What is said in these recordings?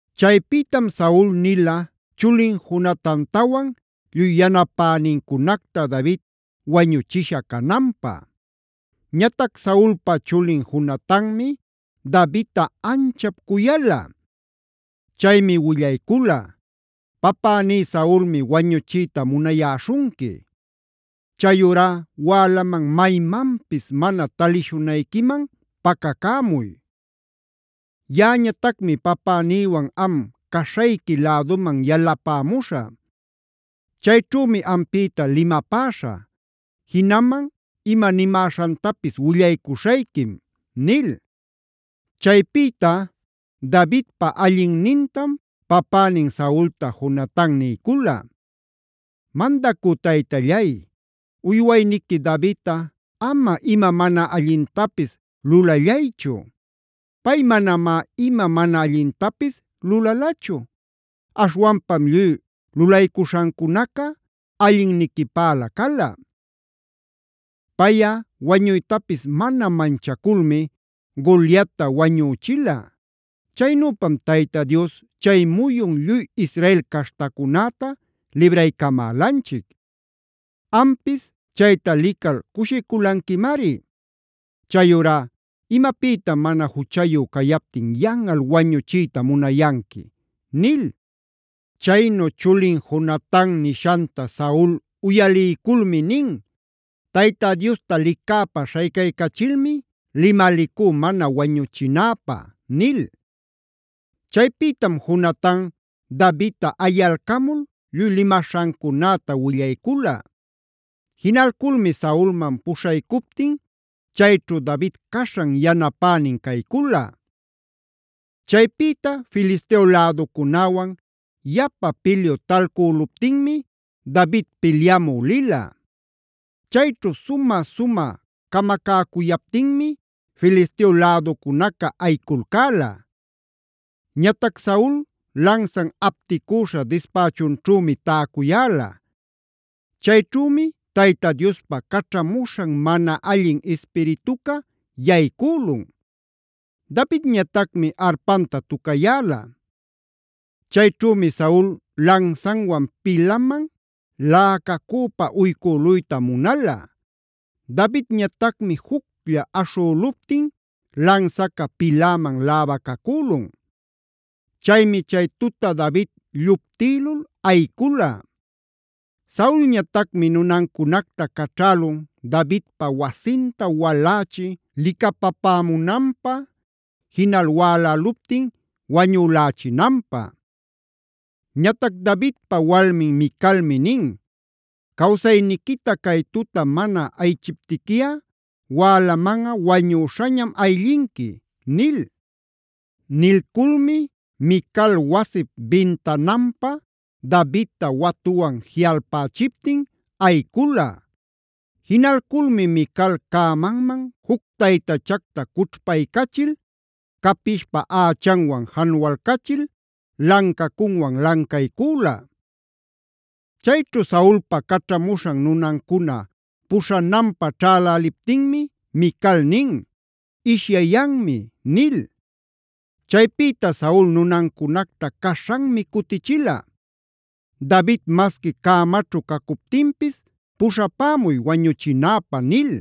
Chaypïtam Saul nila chulin Jonatantawan lluy yanapänincunacta David wañuchisha cananpä. Ñatac Saulpa chulin Jonatanmi Davidta anchap cuyala. Chaymi willaycula: “Papäní Saulmi wañuchiyta munayäśhunqui. Chayurá wälaman maymanpis mana talishunayquiman pacacämuy. Yaꞌañatacmi papänïwan am caśhayqui läduman yalapämuśhä. Chayćhümi ampïta limapäśhä. Jinaman ima nimäśhantapis willaycuśhayquim” nil. Chaypita Davidpa allinnintam papänin Saulta Jonatan niycula: “Mandacü taytallay, uywayniqui Davidta ama ima mana allintapis lulallaychu. Pay manamá ima mana allintapis lulalachu; aśhwanpam lluy lulaycuśhancunaca allinniquipälä cala. Payꞌa wañuytapis mana manchaculmi Goliatta wañüchila. Chaynüpam Tayta Dios chay muyun lluy Israel caśhtacunäta libraycamälanchic. Ampis chayta lical cushiculanquimari. Chayurá ¿imapïtam mana juchayu cayaptin yanꞌal wañuchiyta munayanqui?” nil. Chaynu chulin Jonatan nishanta Saul uyaliyculmi nin: “Tayta Diosta licäpä śhaycaycachilmi limalicú mana wañuchinäpä” nil. Chaypïtam Jonatan Davidta ayalcamul lluy limaśhancunäta willaycula. Jinalculmi Saulman puśhaycuptin chayćhu David caśhan yanapänin caycula. Chaypïta Filisteo läducunäwan yapa pilyu talcüluptinmi David pilyamü lila. Chayćhu sumä-sumä camacäcuyaptinmi Filisteo läducunaca ayiculcäla. Ñatac Saul lansan apticüśha dispächunćhümi täcuyäla. Chayćhümi Tayta Diospa caćhamuśhan mana allin ispirituca yaycülun. Davidñatacmi arpanta tucayäla. Chayćhümi Saul lansanwan pilaman läcacüpa uycüluyta munala. Davidñatacmi juclla aśhüluptin lansaca piläman läbacacülun. Chaymi chay tuta David lluptïlul ayicula. Saulñatacmi nunancunacta caćhälun Davidpa wasinta walächi licapapämunanpä, jinal wäläluptin wañulächinanpä.a Ñatac Davidpa walmin Micalmi nin: “Cawsayniquita cay tuta mana ayichiptiquiꞌa wälamanꞌa wañüśhañam ayllinqui” nil. Nilculmi Mical wasip bintananpä Davidta watuwan jiꞌalpächiptin ayicula. Jinalculmi Mical cämanman juc taytachacta cućhpaycachil capishpa ächanwan janualcachil, lancacunwan lancaycüla. Chayćhu Saulpa caćhamuśhan nunancuna puśhananpä ćhäläliptinmi Mical nin: “Ishyayanmi” nil. Chaypïta Saul nunancunacta caśhanmi cutichila: “David masqui cämaćhu cacuptinpis puśhapämuy wañuchinäpä” nil.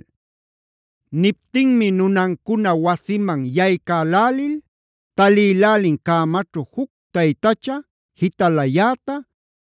Niptinmi nunancuna wasiman yaycälälil talïlälin cämaćhu juc taytacha jitalayäta,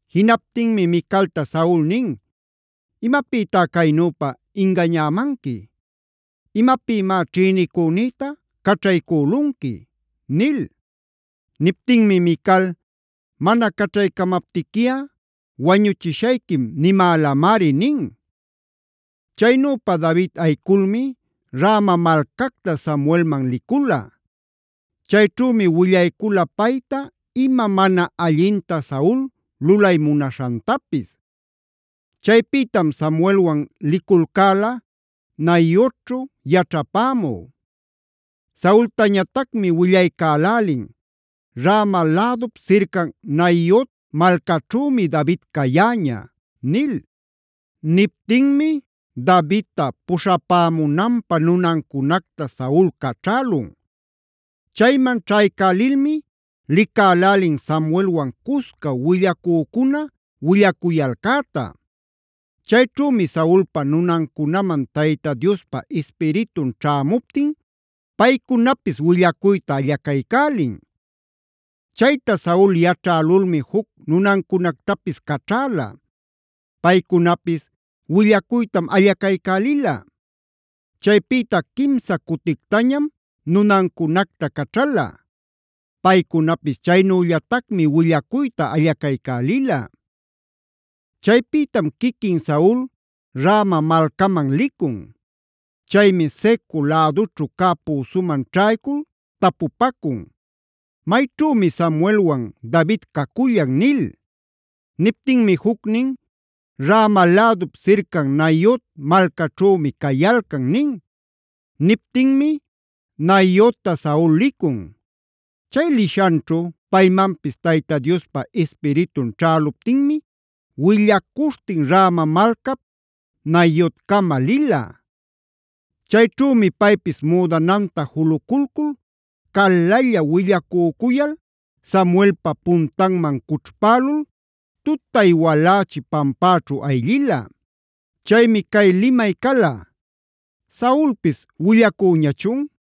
Jinaptinmi Micalta Saul nin: “¿Imapïtá caynüpa ingañämanqui? ¿Imapïmá ćhïnicünïta caćhaycülunqui?” nil. Niptinmi Mical: “ ‘Mana caćhaycamaptiquiꞌa wañuchishayquim’ nimälamari” nin. Chaynüpa David ayiculmi Rama malcacta Samuelman licula. Chayćhümi willaycula payta ima mana allinta Saul lulay munaśhantapis. Chaypïtam Samuelwan liculcäla Naiotćhu yaćhapämü. Saultañatacmi willaycälälin: “Rama lädup sircan Naiot malcaćhümi David cayäña” nil. Niptinmi Davidta puśhapämunanpä nunancunacta Saul caćhälun. Chayman ćhaycälilmi licälälin Samuelwan cusca willacücuna willacuyalcäta. Chayćhümi Saulpa nunancunaman Tayta Diospa Ispiritun ćhämuptin paycunapis willacuyta allacaycälin. Chayta Saul yaćhälulmi juc nunancunactapis caćhäla. Paycunapis willacuytam allacaycälila. Chaypïta quimsa cutictañam nunancunacta caćhala. Paycunapis chaynüllatacmi willacuyta allacaycälila. Chaypïtam quiquin Saul Rama malcaman licun. Chaymi Secu lädućhu cä püsuman ćhaycul tapupacun: “¿Mayćhümi Samuelwan David cacullan?” nil. Niptinmi jucnin: “Rama lädup sircan Naiot malcaćhümi cayalcan” nin. Niptinmi Naiotta Saul licun. Chay lishanćhu paymanpis Tayta Diospa Ispiritun ćhäluptinmi willacuśhtin Rama malcap Naiotcama lila. Chayćhümi paypis müdananta juluculcul calalla willacücuyal Samuelpa puntanman cućhpälul tutay walächi pampäćhu ayllila. Chaymi cay limay cala: “¿Saulpis willacüñachun?”